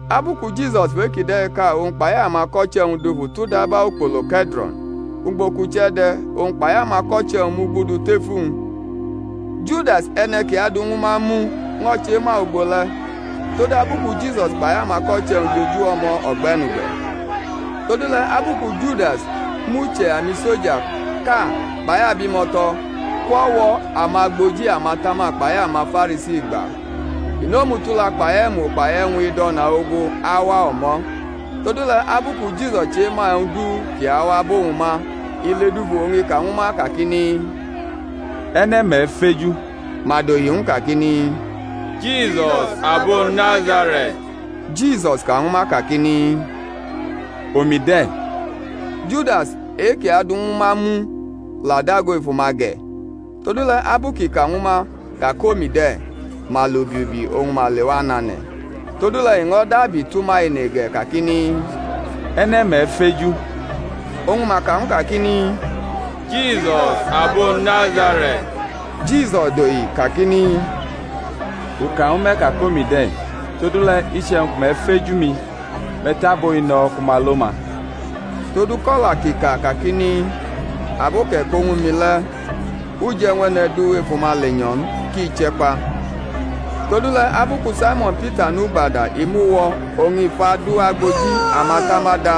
Abu ku Jisus fʼe-kide̩ ka owñ kpai amako̩che̩-wñ dufu tʼudaba ukpolo Ke̩dro̩n, ugbo kʼuche̩ de̩, owñ kpai amako̩che̩-wñ mugudu tef uwñ. Judas, e̩ne̩ ki adʼuwñ ñwu ma mu, ño̩ chema ugbo le̩, todabu ku Jisus kpai amako̩che̩-wñ jeju o̩mo̩ o̩gbe̩nugbe̩. Todule̩ abu ku Judas mʼuche̩ amiso̩jaʼka kpai abimo̩to̩ kwʼo̩wo̩ amagboji amatama kpai amaFarisi gba, i nʼomutula kpai e̩mu kpai e̩wñ ido̩na ogu awa o̩mo̩. Todule̩ abu ku Jisus chema e̩wñ du ki awa abʼowñ ma, i ledufu oñ i ka ñwu ma kakini, E̩ne̩ me̩feju? Madohi ñwu kakini, Jisus abo Nazare̩t. Jisus ka ñwu ma kakini, Omi de̩. Judas, e-kʼi adʼuwñ ñwu ma mu, la dago efu ma ge̩. Todule̩ abu kʼi ka ñwu ma ka kʼomi de̩, ma lʼubi ubi oñ ma lewa nʼane̩. Todule̩ i ño̩ dabi tʼuma ene ge̩ kaikini, E̩ne̩ me̩ feju? Oñ ma ka ñw u kakini, Jisus abo Nazare̩t. Jisus dohi kakini, U ka ñwu me̩ ka kʼomi de̩. Todule̩ iche̩wñ ku me̩ feju mi, me̩ tʼabo-i no̩ ku ma lo ma, todu kʼo̩la kʼi ka kakini, Abo kʼe̩ ko ñwu mi le̩ u je̩ ñw e̩ne̩ du efu ma lenyo̩ n, ki che̩ kpa. Todule̩ abu ku Saimo̩n Pita nʼugbada i mʼu wo̩ oñ i fʼadu agboji amatama da,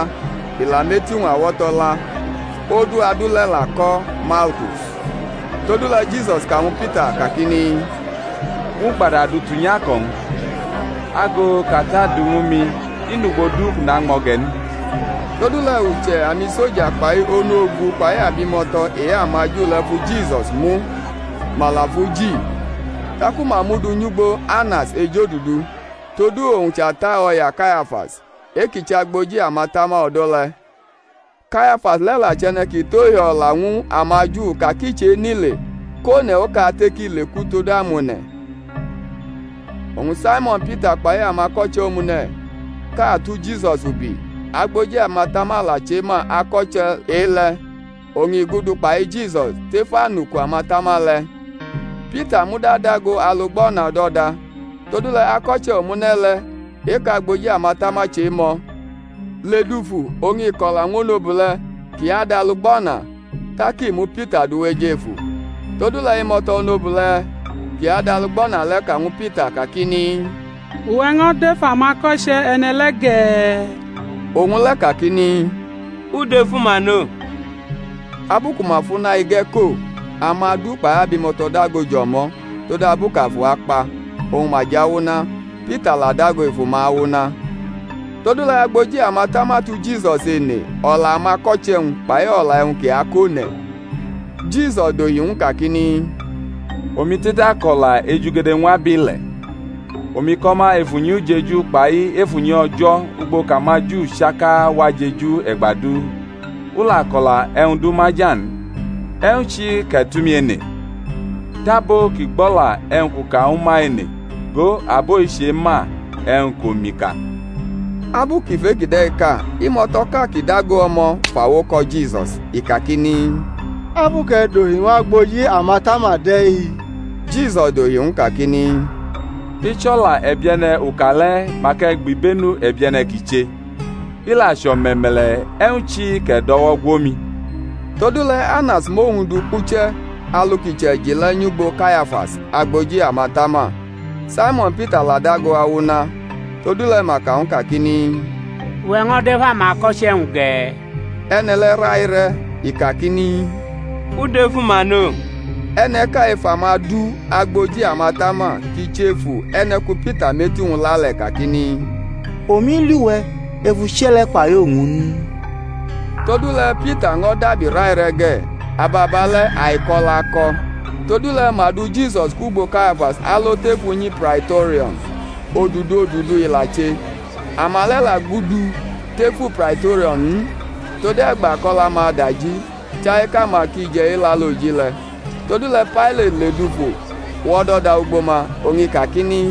i la mʼeti-wñ awo̩to̩ la. Odu adu le̩ la ko̩ Malkus. Todule̩ Jisus ka ñwu Pita kakini, Mʼugbada du tunyʼako̩-wñ; ago kʼAta du ñwu mi i nʼugbo du kʼu nañmo̩ ge̩ n? Todule̩ uche̩ amiso̩ja kpai onu-ogu kpai abimo̩to̩ e-amaju le̩ fu Jisus mu, ma la fʼu ji; taku ma mʼu du nyʼugbo Anas ejodudu, todu owñ chʼata o̩ya Kayafas, e-kʼi chʼagboji amatama o̩do̩ le̩. Kayafas le̩ la chʼe̩ne̩ ki tʼohio̩la ñwu amaju ka ki chenʼile kʼone̩ okate ki leku todu amone̩. Oñ Saimo̩n Pita kpai ako̩che̩ omune̩ʼka tu Jisus ubi. Agboji amatama la chema ako̩che̩ e-le̩, oñ i gudu kpai Jisus tef anuku atama le̩. Pita muda dago alugbana o̩do̩da. Todule̩ ako̩che̩ omune̩ le̩, e-kʼagboji amatama chemʼo̩, ledufu oñ i ko̩la ñw onobule̩ ki adʼalugbana tak i mu Pita du wʼejefu. Todule̩ imo̩to̩ onobule̩ ki adʼalugbana le̩ ka ñwu Pita kakini, Uwe̩ ño̩ dʼef amako̩che̩ e̩ne̩ le̩ ge̩? Owñ le̩ kakini, U dʼefu ma no. Abu ku ma fʼuna-ige̩ ko omadu kpai abimo̩to̩ dago jʼo̩mo̩ todabu kʼafu akpa, oñ ma jʼawuna; Pita la dago efu ma awuna. Todule̩ agboji amatama tu Jisus ene o̩la amako̩che̩-wñ, kpai o̩la e̩wñ kʼi akone̩. Jisus dohi ñw u kakini, Omi te̩tako̩la ejugede ñw abile̩; omi ko̩ ma ef unyi ujeju kpai ef unyi O̩jo̩ ugbo kʼamaJu chaka wa jeju e̩gba du, u la ko̩la e̩wñ du maja n. E̩wñ chi kʼe̩ tʼumi ene? Tʼabo ki gbʼo̩la e̩wñ kʼu ka ñwu ma ene; go, abo-i chema e̩wñ kʼomi ka. Abu kʼi fʼe-kide̩ ka imo̩to̩ʼka ki dago o̩mo̩ fʼawo ko̩ Jisus, i kakini, Abu kʼe̩ dohi ñw agboji amatama de̩-i? Jisus dohi ñw u kakini, I chʼo̩la e̩bie̩ne̩ u ka le̩ mak e̩ gbibenu e̩bie̩ne̩ kʼi che, i la chʼo̩me̩me̩le̩ e̩wñ chi kʼe̩ dʼo̩wo̩ gwo mi? Todule̩ Anas mʼowñ du kpuche̩ alu kʼi che̩ji le̩ nyʼugbo Kayafas, agboji amatama. Saimo̩n Pita la dago awuna. Todule̩ ma ka ñw u kakini, Uwe̩ ño̩ dʼef amako̩che̩-wñ ge̩? E̩ne̩ le̩ raire̩, i kakini, U dʼefu ma no. E̩ne̩ʼka ef amadu agboji amatama, kʼi chʼefu e̩ne̩ ku Pita mʼeti-wñ la le̩, kakini, Omi li we̩ ef uche̩ le̩ kpai owñ n? Todule̩ Pita ño̩ dabi raire̩ ge̩; ababale̩ aiko̩ la ko̩. Todule̩ ma du Jisus kwugbo Kayafas alo tef unyi Praito̩rio̩n, odudodudu i la che. Ama le̩ la gudu tefu Praito̩rio̩n n, tode̩gba kʼo̩la-ma adaji, chai kʼama ki je̩ Elaloji le̩. Todule̩ Pailati ledufu wʼo̩do̩da ugbo ma, oñ i kakini,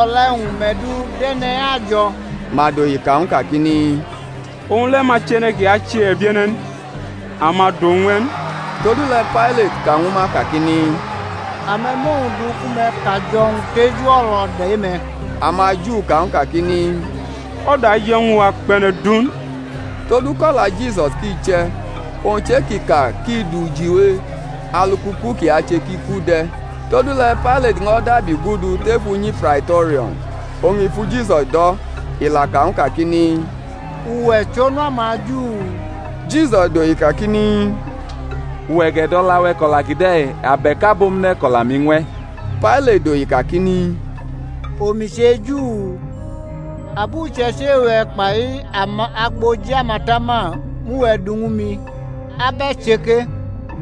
O̩la e̩wñ me̩ du dʼe̩ne̩-i ajo̩? Ma dohi ka ñw u kakini, Owñ le̩ ma chʼe̩ne̩ ki ache e̩bie̩ne̩ n, a ma dʼowñ ñw e̩ n. Todule̩ Pailati ka ñwu ma kakini, A me̩ mʼowñ du ku me̩ kajo̩-wñ teju o̩lo̩da e-me̩. AmaJu ka ñw u kakini, O̩da je̩ ñwu wa kpʼe̩ne̩ du n; todu kʼo̩la Jisus ki che̩, owñ chʼe-kʼi ka kʼi du jiwe alu kʼuku kʼi ache kʼi ku de̩. Todule̩ Pailati ño̩ dabi gudu tef unyi Praito̩rio̩n, oñ i fu Jisus do̩, i la ka ñw u kakini, Uwe̩ chʼOnu amaJu? Jisus dohi kakini, Uwe̩ gʼe̩do̩la-we̩ ko̩la kide̩? abe̩k abomune̩ kʼo̩la-mi ñw e̩? Pailati dohi kakini, Omi che Ju? Abuche̩ichi e-we̩ kpai amagboji amatama inʼuwe̩ du ñwu mi; ab e̩ che ke?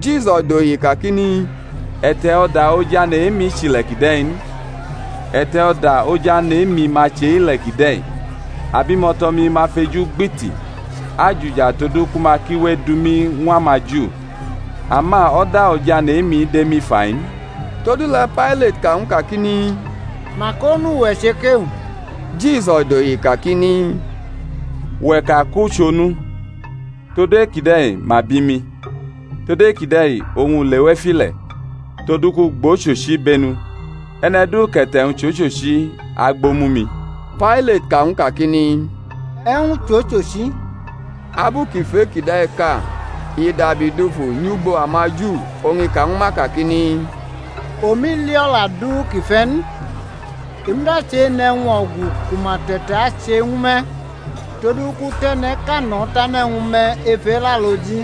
Jisus dohi kakini, E̩te̩ o̩da Ojane̩ e-mi chʼile̩ kide̩ n. E̩te̩ o̩da Ojane̩ e-mi ma chʼe-ile̩ kide̩, abimo̩to̩-mi ma fʼeju gbiti ajuja todu ku ma ki we edu mi ñw amaJu; ama o̩da Ojane̩ e-mi dʼemi fa-i n. Todule̩ Pailati ka ñw u kakini, Mak onu we̩ che ke? Jisus dohi kakini, Uwe̩ ka kʼu chʼonu. Todu e-kide̩ ma bi mi, tod e-kide̩ oñ u lewʼef ile̩, todu kʼu gbʼochochi ibenu. E̩ne̩ du kʼe̩te̩-wñ chʼochochi agbʼomu-mi. Pailati ka ñw u kakini, E̩wñ chʼochochi? Abu kʼi fʼe-kide̩ ka, i dabi dufu nyʼugbo amaJu, oñ i ka ñwu ma kakini, Omi li o̩la du kʼi fe̩ n. I muda chenʼe̩wñ o̩gu ku ma te̩tache ñwu me̩, todu kʼu tʼe̩ne̩ʼka no̩ tane̩ ñwu me̩ ef Elaloji: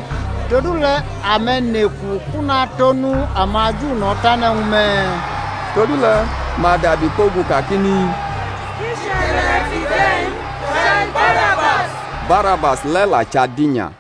todule̩ ame̩ neku kʼu natʼOnu amaJu no̩ tane̩ ñwu me̩? Todule̩ ma dabi kpogu kakini, I chʼe̩ne̩ kide̩ n, chai Barabas. Barabas le̩ la chʼadinya.